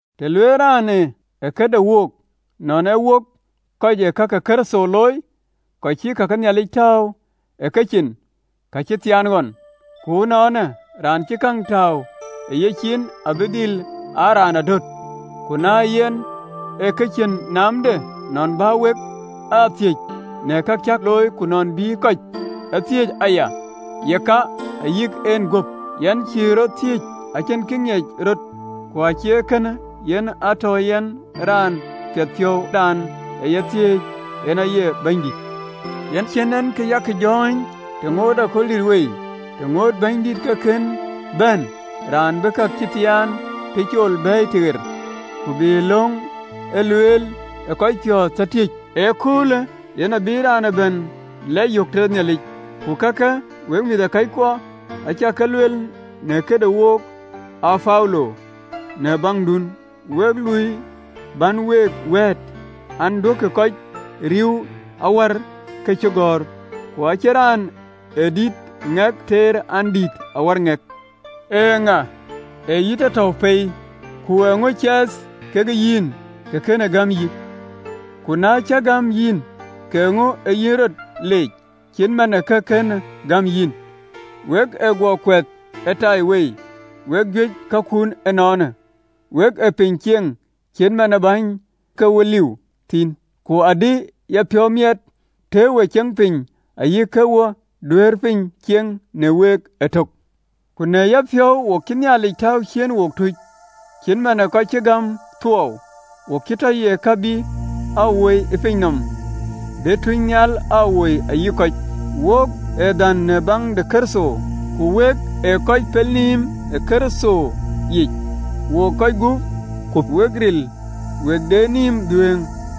Tɔ lueel raan në këde wook nɔn ye wok kɔc ee ka ke Kërtho looi, kɔc cïï ka ke Nhialic tääu ë kecin, kacïmoony ɣɔn. Ku ënɔɔnë, raan cïï käŋ tääu ë yecin, abï dhil aa raan adöt. Ku në yɛn, ee kë cïn naamde nɔn bä wek a thiëëc në ka cä looi, ku nɔn bï kɔc a thiëëc aya: yeka, ayïk ɛn guöp, yɛn cïï rɔt ee thiëëc. Acïn kë ŋiëc rɔt, ku acie kënë yen a tɔ yɛn ë raan piɛthpiɔ̈u: Raan ë ya thiëëc, en aye Bɛ̈nydït. Yen cïn en kë yak jɔ̈ɔ̈ny të ŋoot akööl dït wei, të ŋootë Bɛ̈nydït ke kën bɛ̈n, raan bï ka cï thiaan tëcol bɛ̈ɛ̈i tëɣer, ku bï lööŋ ee lueel ë kɔc piɔ̈ɔ̈th tɔ tiëc, ee köölë yen abïï raan ëbɛ̈n lɛc yök tëde Nhialic. Ku kakë, wek mïthëkɔckuɔ, acä ke lueel në këdï wokë Apolo në baŋdun week, luɔi bän week wɛ̈ɛ̈t an: Duökï kɔc ee riëëu awär këcïgɔ̈ɔ̈r, ku ë cïn raan ë dït ë ŋɛk tɛɛr, an, dïït awär ŋɛk. Eeŋa ë yï tɔ tɔ̈u pei? Ku eeŋö cath ke yïn kë kënë gäm yïn? Ku na cï gäm yïn, ka eeŋö ee yïn rɔt leec, acït man ë kë kënë gäm yïn? We ë guɔ kuɛth ëtaiwei, wek juëc ë kakun ënɔɔnë, wek ë piny cieŋ cït man ë bäny, ke wok liu thïn: ku adï ya piɔ̈u miɛt, tëë we ceŋ piny ë yic, ke wo duëër piny ceŋ në week ëtök. Ku në yapiɔ̈u, wo cïï Nhialic tääu ciëën wok tuuc, cït man ë kɔc cï gäm thuɔɔu: wo cï tɔ ye kë bï aa woi piny nɔm, bï tuucnhial aa woi, ayï kɔc. Wok ee dhän në baŋ de Kërtho, ku wek ee kɔc pelnïïm ë Kërtho yic! Wok kɔ̈c gup, ku wek ril! Wok cïn naamda, ku wek de nïïm dhuëëŋ!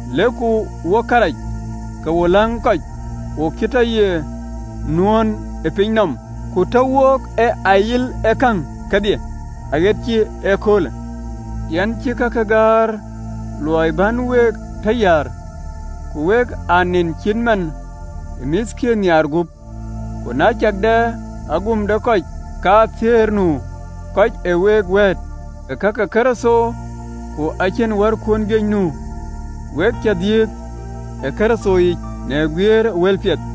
lëkë wo kërac, ke wo läŋ kɔc: wo cï tɔ ye nuöön ë piny nɔm, ku tɔ wook ee ayil ë käŋ kedhie aɣet cï ee köölë. Yɛn cïï kake gäär luɔi bän we tɔ yäär, ku wek a nen cït man ë mïthkiën nhiaar gup. Ku na cäk dɛ agum de kɔc kathiëër nu, kɔc ee week wɛ̈ɛ̈t ë ka ke Kërtho, ku acïn wärkun juëc nu: we cä dhiëëth ë Kërtho yic në guiëër ë wëlpiɛth.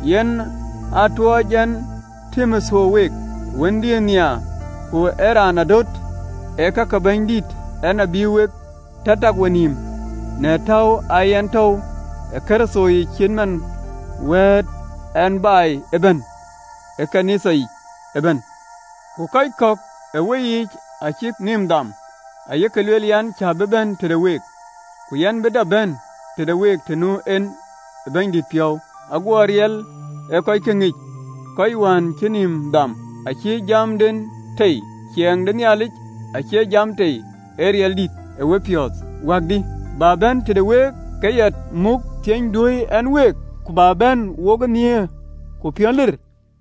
Yen aa tuöc ɛn Timotheo week, ee wëndiën nhiaar ku ee raan adöt ë ka ke Bɛ̈nydït, en abï week tɔ tak wenïïm në täu aa yen tɔ̈u ë Kërtho yic, acït man wɛ̈ɛ̈t ɛn baai ëbɛ̈n në ɣööt ke Nhialic yiic ëbɛ̈n. Ku kɔc kɔ̈k ë weyiic acïk nïïm dham, ayek lueel, an, cä bï bɛ̈n tëde week. Ku yɛn bï dap bɛ̈n tëde week, të nu en ë Bɛ̈nydït piɔ̈u, aguɔ riɛl ë kɔckë ŋic, kɔc wën cï nïïm dham, acie jamden tei. Ciɛɛŋ de Nhialic acie jam tei, ee riɛldït. E wepiɔ̈ɔ̈th wäkdï? Bä bɛ̈n tëde week ke ya muk thieny duöi ɛn week, ku bä bɛ̈n wokë nhiëër ku piɔ̈n ril.